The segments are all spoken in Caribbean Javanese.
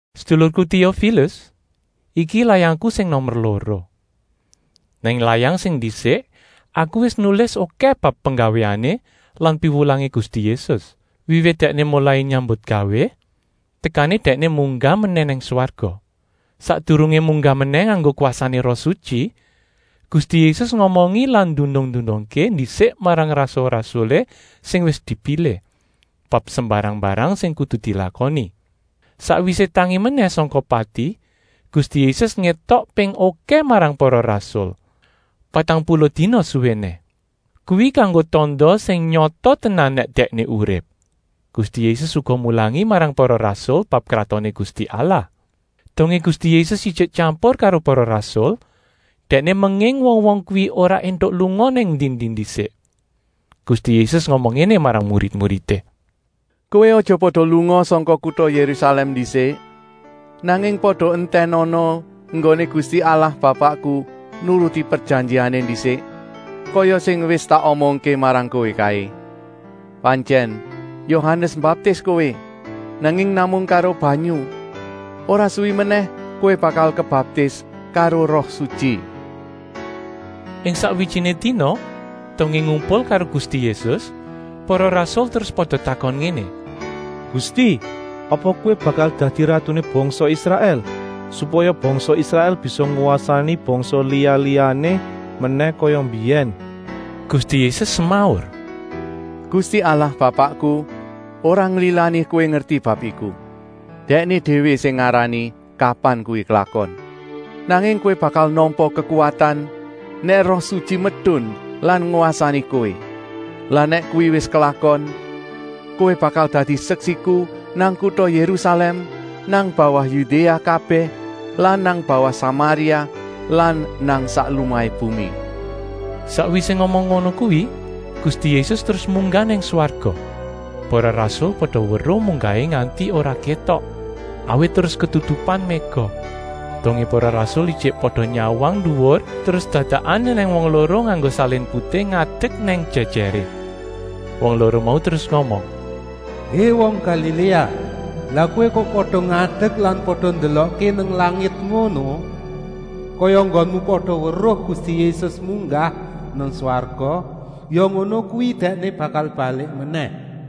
Sedulurku Téofilus, iki layangku sing nomer loro. Nang layang sing ndisik aku wis nulis okèh bab penggawéané lan piwulangé Gusti Yésus, wiwit Dèkné molai nyambutgawé tekané Dèkné munggah menèh nang swarga. Sakdurungé munggah menèh nganggo kwasané Roh Sutyi, Gusti Yésus ngomongi lan ndunung-ndunungké ndisik marang rasul-rasulé sing wis dipilih, bab sembarang-mbarang sing kudu dilakoni. Sakwisé tangi menèh sangka pati, Gusti Yésus ngétok ping okèh marang para rasul, patang puluh dina suwéné. Kuwi kanggo tanda sing nyata tenan nèk Dèkné urip. Gusti Yésus uga mulangi marang para rasul bab Kratoné Gusti Allah. Dongé Gusti Yésus ijik tyampur karo para rasul, Dèkné menging wong-wong kuwi ora éntuk lunga nang endi-endi ndisik. Gusti Yésus ngomong ngéné marang murid-muridé: “Kowé aja pada lunga sangka kuta Yérusalèm ndisik, nanging pada entènana enggoné Gusti Allah Bapakku nuruti prejanjiané ndisik, kaya sing wis tak omongké marang kowé kaé. Pantyèn Yohanes mbaptis kowé, nanging namung karo banyu. Ora suwi menèh kowé bakal kebaptis karo Roh Sutyi.” Ing sakwijiné dina, dongé ngumpul karo Gusti Yésus, para rasul terus pada takon ngéné: “Gusti, apa Kowé bakal dadi ratuné bangsa Israèl, supaya bangsa Israèl bisa ngwasani bangsa liya-liyané menèh kaya mbiyèn!” Gusti Yésus semaur: “Gusti Allah Bapakku ora nglilani kowé ngerti bab iku. Dèkné déwé sing ngarani kapan kuwi klakon. Nanging kowé bakal nampa kekuwatan nèk Roh Sutyi medun lan ngwasani kowé. Lan nèk kuwi wis klakon, kowé bakal dadi seksiku nang kuta Yérusalèm, nang bawah Yudéa kabèh lan nang bawah Samaria lan nang sak lumahé bumi.” Sakwisé ngomong ngono kuwi Gusti Yésus terus munggah nang swarga. Para rasul pada weruh munggahé nganti ora kétok, awit terus ketutupan méga. Dongé para rasul ijik pada nyawang nduwur terus dadakan ènèng wong loro nganggo salin putih ngadek nang jèjèré. Wong loro mau terus ngomong: “Hé wong Galiléa, lah kowé kok pada ngadek lan pada ndelokké nang langit ngono? Kaya enggonmu pada weruh Gusti Yésus munggah nang swarga, ya ngono kuwi Dèkné bakal balik menèh.”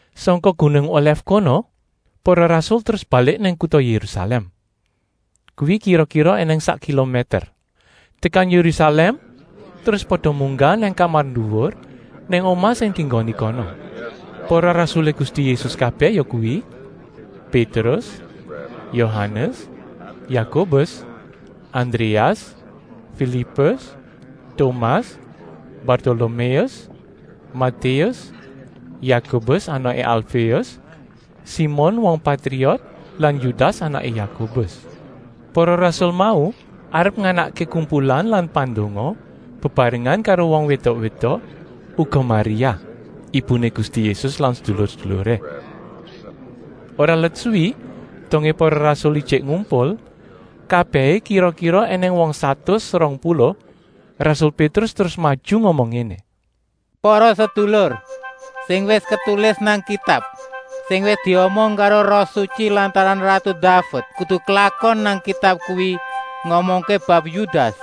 Sangka gunung Olèf kono para rasul terus balik nang kuta Yérusalèm. Kuwi kira-kira ènèng sak kilomèter. Tekan Yérusalèm terus pada munggah nang kamar nduwur nang omah sing dienggoni kono. Para rasulé Gusti Yésus kabèh yakuwi: Pétrus, Yohanes, Yakobus, Andréas, Filipus, Tomas, Bartoloméus, Matéus, Yakobus anaké Alféus, Simon wong Patriot lan Yudas anaké Yakobus. Para rasul mau arep nganakké kumpulan pandonga bebarengan karo wong wédok-wédok, uga Maria, ibuné Gusti Yésus lan sedulur-seduluré. Ora let suwi, dongé para rasul ijik ngumpul, kabèhé kira-kira ènèng wong satus rong puluh, rasul Pétrus terus maju ngomong ngéné: “Para sedulur, sing wis ketulis nang Kitab, sing wis diomong karo Roh Sutyi lantaran ratu Daved, kudu klakon. Nang Kitab kuwi ngomongké bab Yudas,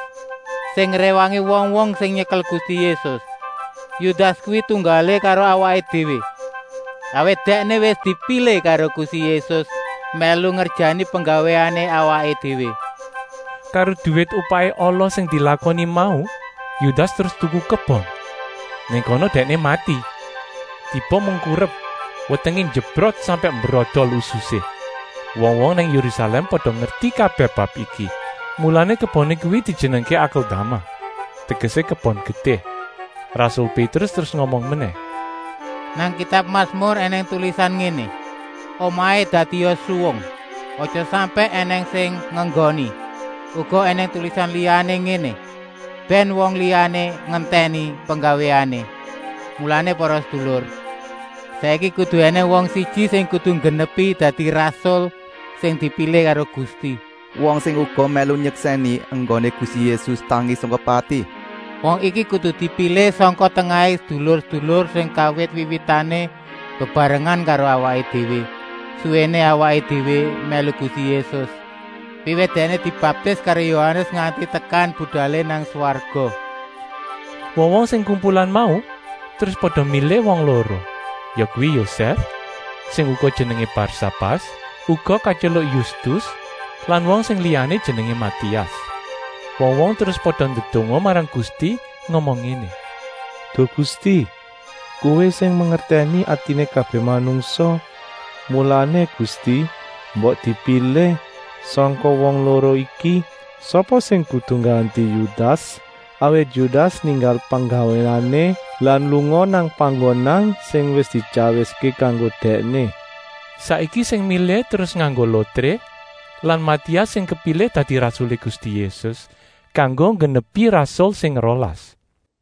sing ngréwangi wong-wong sing nyekel Gusti Yésus. Yudas kuwi tunggalé karo awaké déwé, awit dèkné wis dipilih karo Gusti Yésus mèlu ngerjani penggawéané awaké déwé. “Karo duwit upahé ala sing dilakoni mau Yudas terus tuku kebon. Nang kono dèkné mati, tiba mengkurep, wetengé njebrot sampèk mbrodol ususé. Wong-wong nang Yérusalèm pada ngerti kabèh bab iki, mulané keboné kuwi dijenengké ‘Akeldama’ tegesé: ‘Kebon Getih.’” Rasul Pétrus terus ngomong menèh: “Nang kitab Masmur ènèng tulisan ngéné: ‘Omahé dadia suwung, aja sampèk ènèng sing ngenggoni.’ Uga ènèng tulisan liyané ngéné: ‘Bèn wong liyané nggentèni penggawéané.’ “Mulané para sedulur, saiki kudu ènèng wong siji sing kudu nggenepi dadi rasul sing dipilih karo Gusti, wong sing uga mèlu nyeksèni enggoné Gusti Yésus tangi sangka pati. Wong iki kudu dipilih sangka tengahé sedulur-sedulur sing kawit wiwitané bebarengan karo awaké déwé, suwéné awaké déwé mèlu Gusti Yésus, wiwit Dèkné dibaptis karo Yohanes nganti tekan budalé nang swarga.” Wong-wong sing kumpulan mau terus pada milih wong loro, yakuwi Yosèf, sing uga jenengé Barsabas (uga katyeluk Yustus) lan wong sing liyané jenengé Matias. Wong-wong terus pada ndedonga marang Gusti ngomong ngéné: “Duh Gusti, Kowé sing mangertèni atiné kabèh manungsa. Mulané Gusti, mbok dipilih sangka wong loro iki, sapa sing kudu ngganti Yudas. Awit Yudas ninggal penggawéané lan lunga nang panggonan sing wis dityawiské kanggo dèkné.” Saiki sing milih terus nganggo lotré lan Matias sing kepilih dadi rasulé Gusti Yésus, kanggo nggenepi rasul sing rolas.